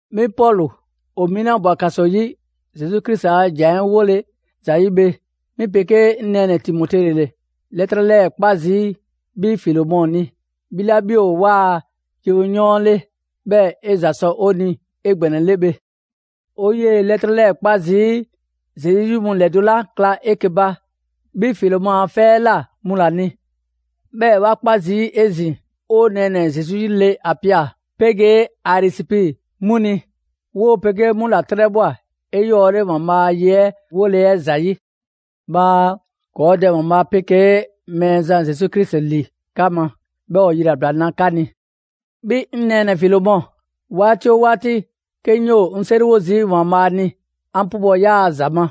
'Mi Pɔlu, ‑o 'mi 'la ꞊bwa ‑kaso 'yi Zesu Krisi a ‑jan 'ɛ 'wole ‑zayi' bhe, 'mi 'pegee 'ŋ nɛɛnɛ‑ Timote ‑le 'lɛtrɛ 'lɛɛ‑ 'kpa zii' 'bhi Filemɔ ni, 'bhi 'la 'bhi ‑o 'waa‑ yewoyɔɔn 'le, 'bhɛɛ‑ 'e ‑za sɔ 'o ni 'egbɛnɛle bhe. 'O 'yee‑ 'lɛtrɛ 'lɛɛ‑ 'kpa zii' Zesu 'yi mu ‑lɛdo' 'la kla 'eke‑ ba 'bhi Filemɔ a 'fɛ 'ɛ ꞊la 'mu ‑la ni, 'bhɛɛ‑ 'wa 'kpa zii' 'ezin‑ 'o nɛɛnɛ‑ Zesu 'yi le Apia, 'pegee Arisipi 'mu ni; ‑woo' 'pegee 'mu ‑la 'trɛbhwa꞊ 'eyɔɔle ‑Waanbhaa' a ye 'ɛ 'wole‑ 'ɛ ‑zayi'. Bhaa ‑kɔɔ' Dɛ ‑Waanbhaa' 'pegee Mɛɛzan Zesu Krisi ‑li 'ka ma, 'bhɛɛ‑ ‑o yilabla na 'ka ni. 'Bhi 'ŋ nɛɛnɛ‑ Filemɔ, 'waati 'oo 'waati, 'ke 'ŋ 'yoo‑ 'ŋ 'seriwo zii' ‑Waanbhaa' ni, 'an 'pubɔ‑ 'yaa‑ ‑za ma.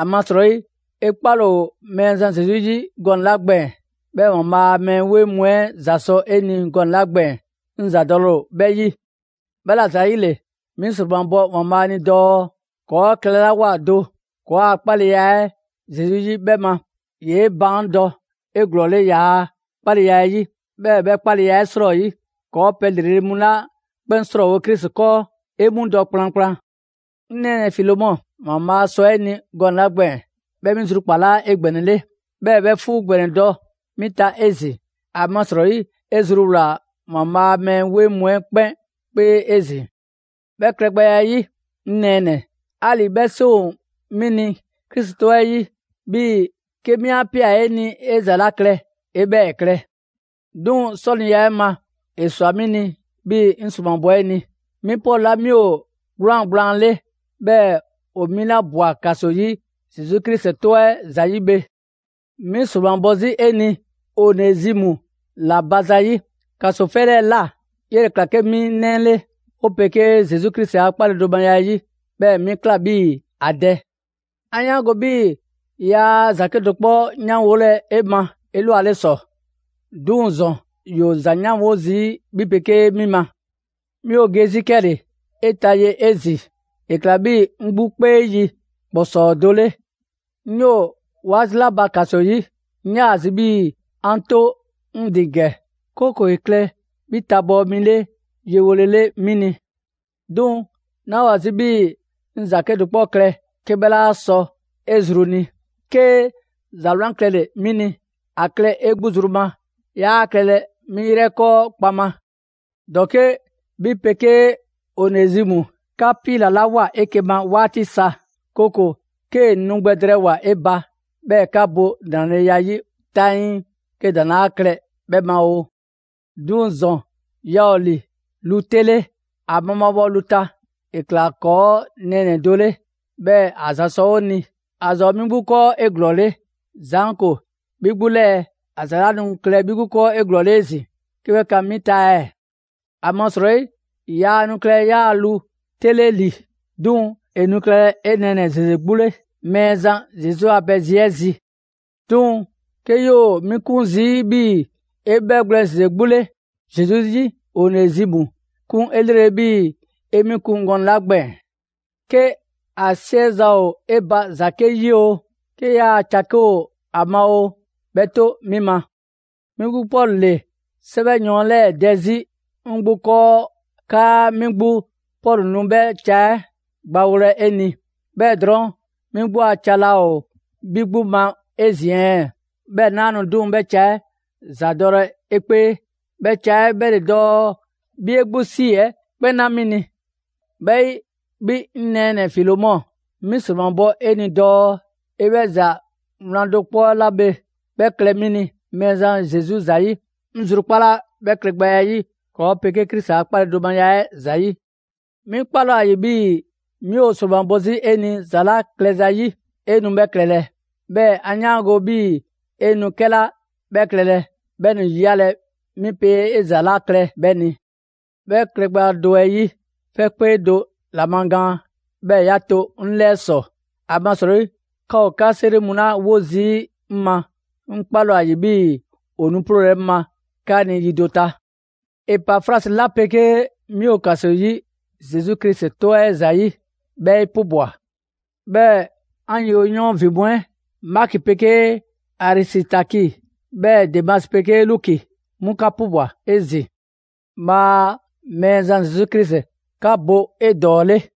‑Amasrɔyi 'e 'kpale‑ ‑o Mɛɛzan Zesu 'yi gɔnɛ‑ 'la gbɛɛn‑, 'bhɛɛ‑ ‑Waanbhaa' a mɛɛ 'weŋ mu 'ɛ ‑za sɔ 'e ni gɔnɛ‑ 'la gbɛɛn‑, 'ŋ ‑zadɔle ‑o 'bhɛ 'yi. 'Bhɛla‑ ‑zayile, 'mi ‑sromabɔ ‑Waanbhaa' ni dɔɔ ‑kɔɔ' klɛlawoa do ‑kɔɔa' 'kpaleya 'ɛ Zesu 'yi 'bhɛ ma, ‑yee' baandɔ 'eglɔɔle 'yaa‑ 'kpaleya 'ɛ 'yi; 'bhɛɛ‑ 'bhɛ 'kpaleya 'ɛ 'srɔyi, ‑kɔɔ' pɛ ‑lrele' mu 'la 'kpɛn 'srɔɔwo‑ Krisi 'kɔɔ, 'e 'mu dɔ kplankplan. 'Ŋ nɛɛnɛ‑ Filemɔ, ‑Waanbhaa' sɔ 'e ni gɔnɛ‑ 'la gbɛɛn‑, 'bhɛ 'mi zrukpalaa 'egbɛnɛle, 'bhɛɛ‑ 'bhɛ 'fuu ‑gbɛnɛ dɔ 'mi ta 'ezin‑. ‑Amasrɔyi 'e zruwlaa‑ ‑Waanbhaa' a mɛɛ 'weŋ mu 'ɛ 'kpɛn 'kpee 'ezin‑. 'Bhɛ klɛgbɛya 'ɛ 'yi, 'ŋ nɛɛnɛ‑, 'ali‑ 'bhɛ 'seŋ ‑o 'mi ni Krisi 'tɔ 'ɛ 'yi 'bhii‑ 'ke 'mi 'a ꞊pia 'e ni 'e ‑za 'la klɛ 'e 'bhɛɛ‑ klɛ. 'Duŋ‑ 'sɔniya 'ɛ ma, ‑e ꞊swa 'mi ni, 'bhii‑ 'ŋ ‑sromabɔ 'e ni. 'Mi Pɔlu 'la 'mi ‑o 'gwlaan‑ gblaan 'le, 'bhɛɛ‑ ‑o 'mi 'la ꞊bwa ‑kaso 'yi Zesu Krisi 'tɔ 'ɛ ‑zayi' bhe. 'Mi ‑sromabɔ 'zi 'e ni Onezimu ‑la ba ‑zayi'; ‑kaso 'fɛ 'lɛɛ‑ ꞊la, 'yele‑ ‑kla 'ke 'mi 'nɛ 'le 'o 'pegee Zesu Krisi a 'kpaledomaya 'ɛ 'yi, 'bhɛɛ‑ 'mi ‑kla 'bhii‑ ‑a dɛ. 'An 'yaango‑ 'bhii‑ yaa ‑za 'kedo‑ 'kpɔ 'yanwolɛ 'e ma 'elwaleta ‑sɔ, 'duŋ‑ ‑zɔn, ‑yoo ‑za 'yanwo zii' 'bhi 'pegee 'mi ma. 'Mi ‑o ge 'zi 'kɛle‑ 'e ta ye 'ezin‑; ‑e ꞊kla 'bhii‑ 'ŋ 'gbu 'kpee yi ‑kpɔsɔɔ do 'le. 'Ŋ 'yoo‑ 'waati 'la ba ‑kaso 'yi, 'ŋ 'yaa‑ zi bi 'bhii‑ 'an 'to 'ŋ ‑din ‑gɛ, 'kooko‑ ‑e klɛ 'bhi tabɔɔ mi 'le yewolele 'mi ni. 'Duŋ‑, 'naa‑ ‑o ‑a zi 'bhii‑ 'ŋ ‑za 'kedo‑ 'kpɔ klɛ 'ke 'bhɛ 'laa sɔ 'e zru ni: 'kee ‑za 'wlan klɛle‑ 'mi ni, ‑a klɛ 'e 'gbu zru ma, 'yaa klɛlɛ 'mi 'yrɛ 'kɔɔ kpaŋma. ‑Dɔke' 'bhi 'pegee Onezimu, 'ka 'piilalawoa 'eke‑ ma 'waati sa; 'kooko‑ 'kee‑ nu gbɛ drɛɛwoa‑ 'e ba, 'bhɛɛ‑ 'ka bo ‑nraleya 'yi 'taŋii 'ke ‑daŋ' 'laa klɛ 'bhɛ ma oo. 'Duŋ‑ ‑zɔn, yaa ‑o ‑li lu 'te 'le, ‑a mabhaabhɔ lu ta; ‑e ‑kla ‑kɔɔ' nɛɛnɛ‑ do 'le, 'bhɛɛ‑ ‑a ‑za sɔ 'o ni. ‑A ‑za ‑o 'mi 'gbu 'kɔɔ 'eglɔɔle; ‑zaanko 'bhi 'gbu 'lɛɛ‑, ‑a ‑za 'laa nu klɛlɛ 'bhi 'gbu 'kɔɔ 'eglɔɔle 'ezin‑ 'ke 'bhɛ kan 'mi ta ɛɛ? ‑Amasrɔyi yaa nu klɛlɛ 'yaa‑ lu 'te 'le ‑li, 'duŋ‑ ‑e nu klɛlɛ 'e nɛɛnɛ‑ ‑zeze 'gbu 'le Mɛɛzan Zesu a pɛ zi 'ɛ zi. 'Duŋ‑ 'ke 'yoo‑ 'mi 'kun zii' 'bhii‑ 'e 'bhɛgwlɛn‑ ‑zeze 'gbu 'le Zesu 'yi, Onezimu 'kun 'elrele 'bhii‑ 'e 'mi kun gɔnɛ‑ 'la gbɛɛn‑. 'Ke ‑a 'siɛza‑ ‑o 'e ba ‑za 'ke 'yi oo, 'ke 'yaa‑ ca 'ke ‑o ‑a ma oo, 'bhɛ 'to 'mi ma. 'Mi 'gbu Pɔlu ‑le 'sɛwɛyɔɔn 'lɛɛ dɛ 'zi 'ŋ 'gbu 'kɔɔ 'kaa 'mi 'gbu Pɔlu nu 'bhɛ ca 'ɛ gbawolɛ 'e ni. 'Bhɛɛ‑ drɔɔn', 'mi 'gbu a ca laa ‑o 'bhi 'gbu ma 'ezin‑ ɛɛ? 'Bhɛɛ‑ 'naa‑ nu 'duŋ‑ 'bhɛ ca 'ɛ ‑za dɔlɛ 'e 'kpee: 'bhɛ ca 'ɛ 'bhɛ ‑le dɔɔ 'bhi 'e 'gbu ‑si 'ɛ 'kpɛn 'na 'mi ni. 'Bhɛ 'yi, 'bhi 'ŋ nɛɛnɛ‑ Filemɔ, 'mi ‑sromabɔ 'e ni dɔɔ 'e 'bhɛ ‑za 'wlan do 'kpɔ 'la bhe 'bhɛ klɛ 'mi ni Mɛɛzan Zesu ‑zayi'. 'Ŋ zrukpala 'bhɛ klɛgbɛya 'ɛ 'yi ‑kɔɔ' 'pegee Krisi a 'kpaledomaya 'ɛ ‑zayi'. 'Mi 'kpale‑ ‑o ‑a ‑yi 'bhii‑ 'mi ‑o ‑sromabɔ 'zi 'e ni ‑za 'la klɛza 'yi, 'e nu 'bhɛ klɛlɛ. 'Bhɛɛ‑ 'an 'yaango‑ 'bhii‑ 'e nu 'kɛla 'bhɛ klɛlɛ, 'bhɛ nu ‑yiyalɛ 'mi pe 'e ‑za 'la klɛ 'bhɛ ni. 'Bhɛ klɛgbɛya do 'ɛ 'yi, 'fɛ 'kpee do ‑lɛmagaan, 'bhɛɛ‑ 'ya 'to 'ŋ 'lɛɛ ‑sɔ, ‑amasrɔyi 'ka ‑o 'ka 'seri mu 'la 'wo zii' 'ŋ ma, 'ŋ 'kpale‑ ‑o ‑a ‑yi 'bhii‑ ‑o nu 'ploolɛ‑ 'ŋ ma 'ka ni yi do ta. Epafrasi 'la 'pegee 'mi ‑o ‑kaso 'yi Zesu Krisi 'tɔ 'ɛ ‑zayi', 'bhɛ 'e 'pubwa‑. 'Bhɛɛ‑ 'an yewoyɔɔn ‑vin mu 'ɛ, Maki 'pegee Arisitaki, 'bhɛɛ‑ Demasi 'pegee Luki, 'mu 'ka 'pubwa‑ 'ezin‑. Bhaa Mɛɛzan Zesu Krisi 'ka bo 'edɔɔle!